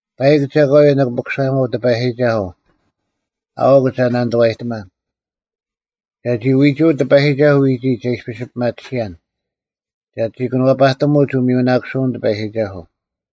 ᐸᐃᒄ ᒐᒂᔪᐤ ᓂᑭ ᐱᑯᓴᔨᒪᐤ ᑎᐸᔨᒋᒐᓱᐤ, ᐊᐅᒄ ᒐ ᓇᓂᑐᐛᔨᑎᒪᓐ; ᒐᒋ ᐎᒍᐅᒡ ᑎᐸᔨᒋᒐᓱᐤ ᐎᒋᒡ ᒐ ᐃᔅᐱᔅ ᐱᒪᑎᓯᔭᓐ, ᒐᒋ ᑭᓄᐛᐸᑎᒧᒡ ᐅᒥᔪᓇᑯᓯᐅᓐ ᑎᐸᔨᒋᒐᓱᐤ,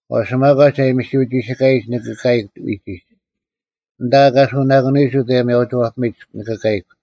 ᐛᔅ ᒪᒂᒡ ᐊ ᐊᔨᒥ ᒋᓯᑲᔨᒡ ᓂᑭ ᑲᔨᒄ ᐎᒋᒡ: ᐊᓐᑕ ᐊᑲᓱᓇᑯᓂᔨᒡ ᐅᑦ ᐊᔭᒥᐊᐅᒋᐛᐱᒥᒡ ᓂᑭ ᑲᔨᒄ;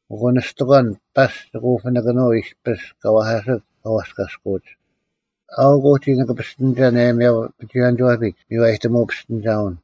ᐊᑯ ᓂᔅᑎᒂᓐ ᐸᔅᒡ ᒋᑭ ᐅᐱᓇᑭᓄᐤ ᐃᔅᐱᔅ ᑲ ᐛᐧᑲᓯᒡ ᑲ ᐛᔅᑲᔅᑯᐅᒡ: ᐊᐅᒄ ᐅᒋ ᓂᑭ ᐱᔅᑎᓂᒐᓐ ᐊᔭᒥᐊᐅᐱᒍᐎᔭᓂᒋᐛᐱᒡ ᒥᔽᔨᑎᒧᐅ ᐱᔅᑎᓂᒐᐅᓐ;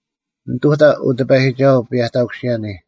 ᓂᑐᑕ, ᐅ ᑎᐸᔨᒋᒐᓱᐤ, ᐱᔭᑕᑯᓯᔭᓂ: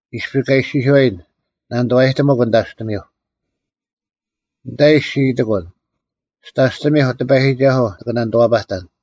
ᐃᔅᐱ ᑲ ᐃᔅᒋᔄᔨᓐ, “ᓇᓂᑐᐛᐸᑎᒧᒄ ᓂᑕᔅᑎᒥᐧᒄ,” ᓂᑕᐃ ᔅᒋ ᐃᑎᑯᓐ, “ᒋᑕᔅᑎᒥᐧᒄ, ᑎᐸᔨᒋᒐᓱᐤ, ᓂᑭ ᓇᓂᑐᐛᐸᑕᓐ᙮”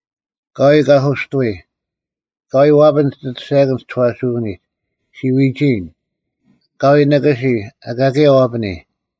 ᐊᑲᐎᔾ ᑲᓱᔅᑐᐎ; ᐊᑲᐎᔾ ᐛᐱᓐ ᒋᑦ ᐊᑐᔅᒐᔭᑭᓐ ᒋ ᒋᐛᓱᐅᓂᒡ: ᔅᒋ ᐎᒋᐃᔨᓐ: ᐊᑲᐎᔾ ᓂᑭᓯ, ᐊᑲ ᑭᔭ ᐛᐱᓂ,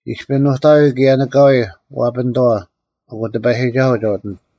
ᐃᔅᐱ ᓄᑕᐎᔾ ᑭᔭ ᓂᑲᐎᔾ ᐛᐱᓂᑥᐛ, ᐊᑯ ᑎᐸᔨᒋᒐᓱᐤ ᒐ ᐅᑎᓂᑦ᙮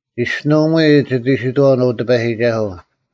ᒋᔅᒋᓄᐊᒧᐎ ᒋᑦ ᐃᓯᑥᐅᓐ, ᐅ ᑎᐸᔨᒋᒐᓱᐤ,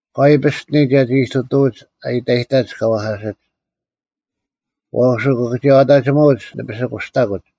ᐊᑲᐎᔾ ᐱᔅᑎᓂ ᒐᒋ ᐃᑐᑐᐎᒡ ᐊ ᐃᑕᔨᑕᒡ ᑲ ᐛᐧᑲᓯᒡ: ᐛᔅ ᐅᑭᑭᒋᔭᐛᑕᒋᒧᐅᒡ ᓂ ᐱᓯᑯᔅᑕᑯᒡ,